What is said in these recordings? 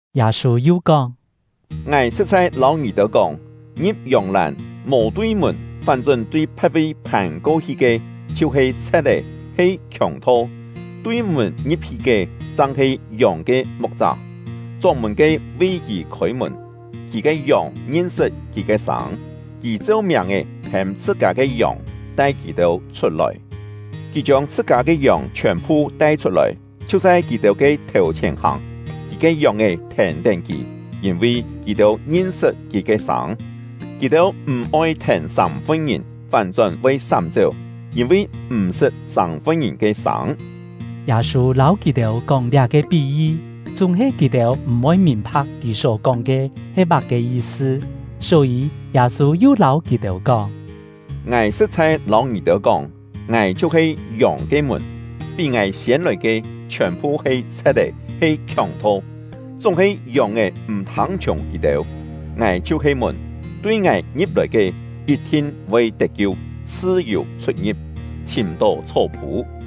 Yâ-sû yu kóng: “Ngài sṳ̍t-chhai lâu ngì-têu kóng, ngi̍p yòng-làn, mò tui mùn, fán-chón tui phe̍t-vi phàn-ko-hi ke, chhiu-he chhe̍t-é, he khiòng-tho. Tui mùn ngi̍p-hi ke, chang he yòng ke mu̍k-chá. Chóng-mùn-ke vi kì khôi-mùn; kì ke yòng ngin-sṳt kì ke sâng. Kì cheu miàng-è hêm chhṳ-kâ ke yòng, tai kì-têu chhut-lòi. Kì chiông chhṳ-kâ ke yòng chhiòn-phu tai-chhut-lòi, chhiu chhai kì-têu ke thèu-chhièn hàng; kì ke yòng-è thèn-tén kì, yîn-vi kì-têu ngin-sṳt kì ke sâng. Kì-têu m̀-oi thèn sâng-fun-ngìn, fán-chón voi sám-chéu, yîn-vi m̀ sṳt sâng-fun-ngìn ke sâng.” Yâ-sû lâu kì-têu kóng liá-ke pí-yi, chúng-he kì-têu m̀-voi mìn-pha̍k kì só kóng ke he má-ke yi-sṳ. Só-yî, Yâ-sû yu lâu kì-têu kóng: “Ngài sṳ̍t-chhai lâu ngì-têu kóng, ngài chhiu-he yòng ke mùn. Pí ngài siên lòi ke, chhiòn-phu he chhe̍t-é, he khiòng-tho; chúng-he yòng-è m̀ thâng-chhiùng kì-têu. Ngài chhiu-he mùn; tui ngài ngi̍p-lòi ke, yit-thin voi tet-kiu, chhṳ-yù chhut-ngi̍p, chhìm-tó chhó-phû.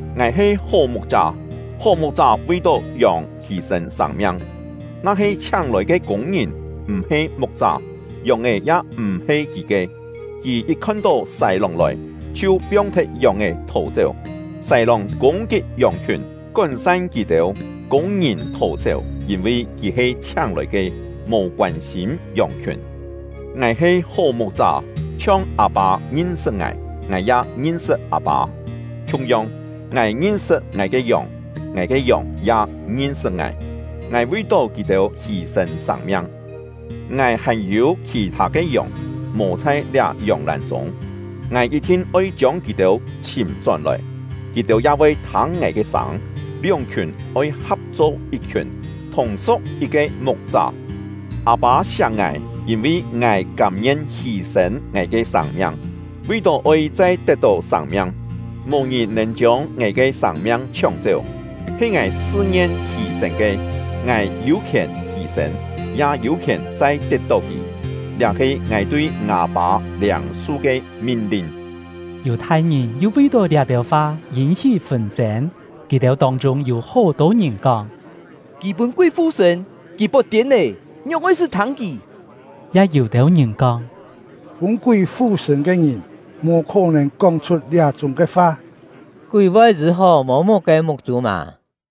“Ngài he hó mu̍k-chá; hó mu̍k-chá vi-tó yòng hî-sên sâng-miang. Na-he chhiáng-lòi ke kûng-ngìn, m̀-he mu̍k-chá, yòng-è ya m̀-he kì ke, kì yit khon-tó sài-lòng lòi, chhiu piong-thet yòng-è thò-chéu; sài-lòng kûng-kit yòng-khiùn, kón-san kì-têu. Kûng-ngìn thò-chéu, yîn-vi kì he chhiáng-lòi ke, mò koân-sîm yòng-khiùn. “Ngài he hó mu̍k-chá. Chhiong Â-pâ ngin-sṳt ngài, ngài ya ngin-sṳt Â-pâ; khiung-yong, ngài ngin-sṳt ngài ke yòng, ngài ke yòng ya ngin-sṳt ngài. Ngài vi-tó kì-têu hî-sên sâng-miang. Ngài hàn-yû khì-thâ ke yòng, mò chhai liá yòng-làn chûng; ngài yit-thin oi chiông kì-têu chhìm-chón-lòi, kì-têu ya voi thâng ngài ke sâng; lióng-khiùn oi kap-cho yit-khiùn, thùng su̍k yit-ke mu̍k-chá. “Â-pâ siak ngài, yîn-vi ngài kâm-ngien hî-sên ngài ke sâng-miang, vi-tó oi chai tet-tó sâng-miang. Mò ngìn nèn chiông ngài ke sâng-miang chhióng-chéu, he ngài chhṳ-ngien hî-sên ke; ngài yû khièn hî-sên, ya yû-khièn chai tet-tó kì. Liá he ngài tui ngâ Pâ liâng-su ke min-lin.” Yù-thai-ngìn yu vi-tó liá-têu fa yîn-hí fûn-chên. Kì-têu tông-chûng yû hó-tô ngìn kóng: “Kì pûn kúi fu-sṳ̂n! Kì pot-tiên lé! Ngióng oi-sṳ́ thâng kì?” Ya yû-têu ngìn kóng: “Pûn kúi fu-sṳ̂n ke ngìn mò khó-nèn kóng-chhut liá-chúng ke fa! Kúi voi yî-hó mô-muk ke muk-chû mâ?”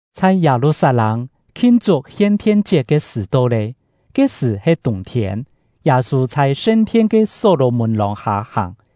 Chhai Yâ-lu-sat-lâng, khin-chuk Hien-thien-chiet ke sṳ̀ to lé; ke-sṳ̀ he tûng-thiên. Yâ-sû chhai sṳn-thien ke Só-lò-mùn lòng-hâ hàng;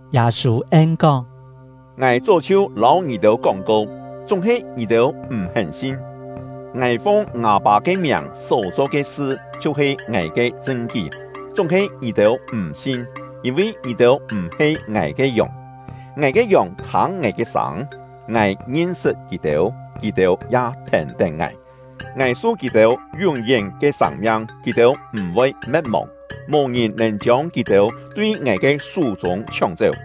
Yâ-sû en-kóng: “Ngài chó chhiu lâu ngì-têu kóng-ko, chúng-he ngì-têu m̀-hén sin. Ngài fung ngâ Pâ ke miàng só-cho ke sṳ chhiu-he ngài ke chṳn-kí; chúng-he ngì-têu m̀ sin, yîn-vi ngì-têu m̀-he ngài ke yòng. Ngài ke yòng thâng ngài ke sâng; ngài ngin-sṳt kì-têu, kì-têu ya thèn-tén ngài. Ngài su kì-têu yún-yén ke sâng-miang, kì-têu m̀-voi me̍t-mòng; mò-ngìn nèn chiông kì-têu tui ngài ke sú-chûng chhióng-chéu.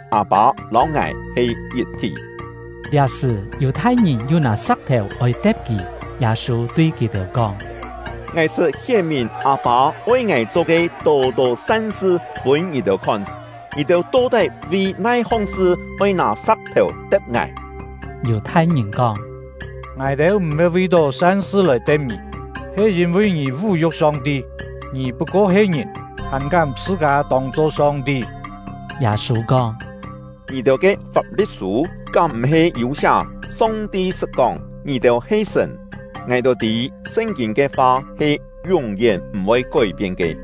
Â-pâ lâu ngài he yit-thí.” Liá-sṳ̀, Yù-thai-ngìn yu nâ sa̍k-thèu oi te̍p kì. Yâ-sû tui kì-têu kóng: “Ngài sṳt hién-mìn Â-pâ oi ngài cho ke tô-tô san-sṳ pûn ngì-têu khon; ngì-têu to-tái vi nai-hong sṳ oi nâ sa̍k-thèu te̍p ngài?” Yù-thai-ngìn kóng: “Ngài-têu m̀-he vi-tó san-sṳ lòi te̍p ngì, he yîn-vi ngì vú-yu̍k Song-ti! Ngì put-ko he ngìn, hàn kám chhṳ-kâ tông-cho Song-ti!” Yâ-sû kóng: “Ngì-têu ke Fap-li̍t-sû kám m̀-he yû siá, Song-ti sṳt kóng: ‘Ngì-têu he sṳ̀n’? Ngài-têu tî Sṳn-kîn ke fa he yún-yén m̀-voi kói-pien ke.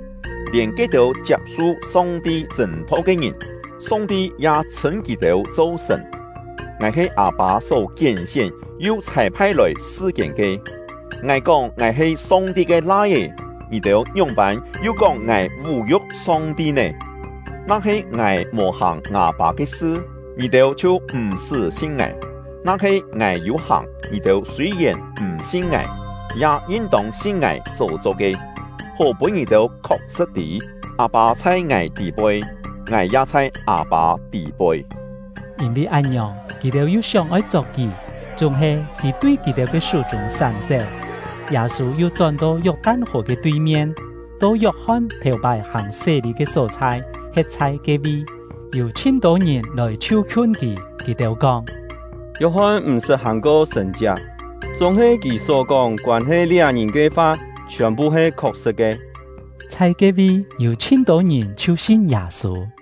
Lièn ke-têu chiap-su Song-ti chṳ̂n-tho ke ngìn, Song-ti ya chhṳ̂n kì-têu cho sṳ̀n; ngài he Â-pâ só kién-sién yu chhâi-phai lòi sṳ-kiên ke; ngài kóng ngài he Song-ti ke Lai-é, ngì-têu ngióng-pân yu kóng ngài vú-yu̍k Song-ti nè? Na-he ngài mò hàng ngâ Pâ ke sṳ, ngì-têu chhiu m̀-sṳ́ sin ngài; na-he ngài yû hàng, ngì-têu sûi-yèn m̀ sin ngài, ya yin-tông sin ngài só-cho ke, hó pûn ngì-têu khok-sṳ̍t tî: Â-pâ chhai ngài tî-poi, ngài ya chhai Â-pâ tî-poi.” Yîn-vi án-ngiòng, kì-têu yu sióng-oi chok kì, chúng-he kì tui kì-têu ke sú-chûng sám-chéu. Yâ-sû yu chón-to Yok-tan-hò ke tui-mien, to Yok-hon thèu-pái hàng sé-lî ke só-chhai, he̍t chhai ke-vi. Yû chhin-tô ngìn lòi chhiu-khiun kì. Kì-têu kóng: “Yok-hon m̀-sṳt hàng-ko sṳ̀n-chiak, chúng-he kì só-kóng koân-he liá ngìn ke fa chhiòn-phu he khok-sṳ̍t ke.” Chhai ke-vi, yû chhin-tô ngìn chhiu sin Yâ-sû.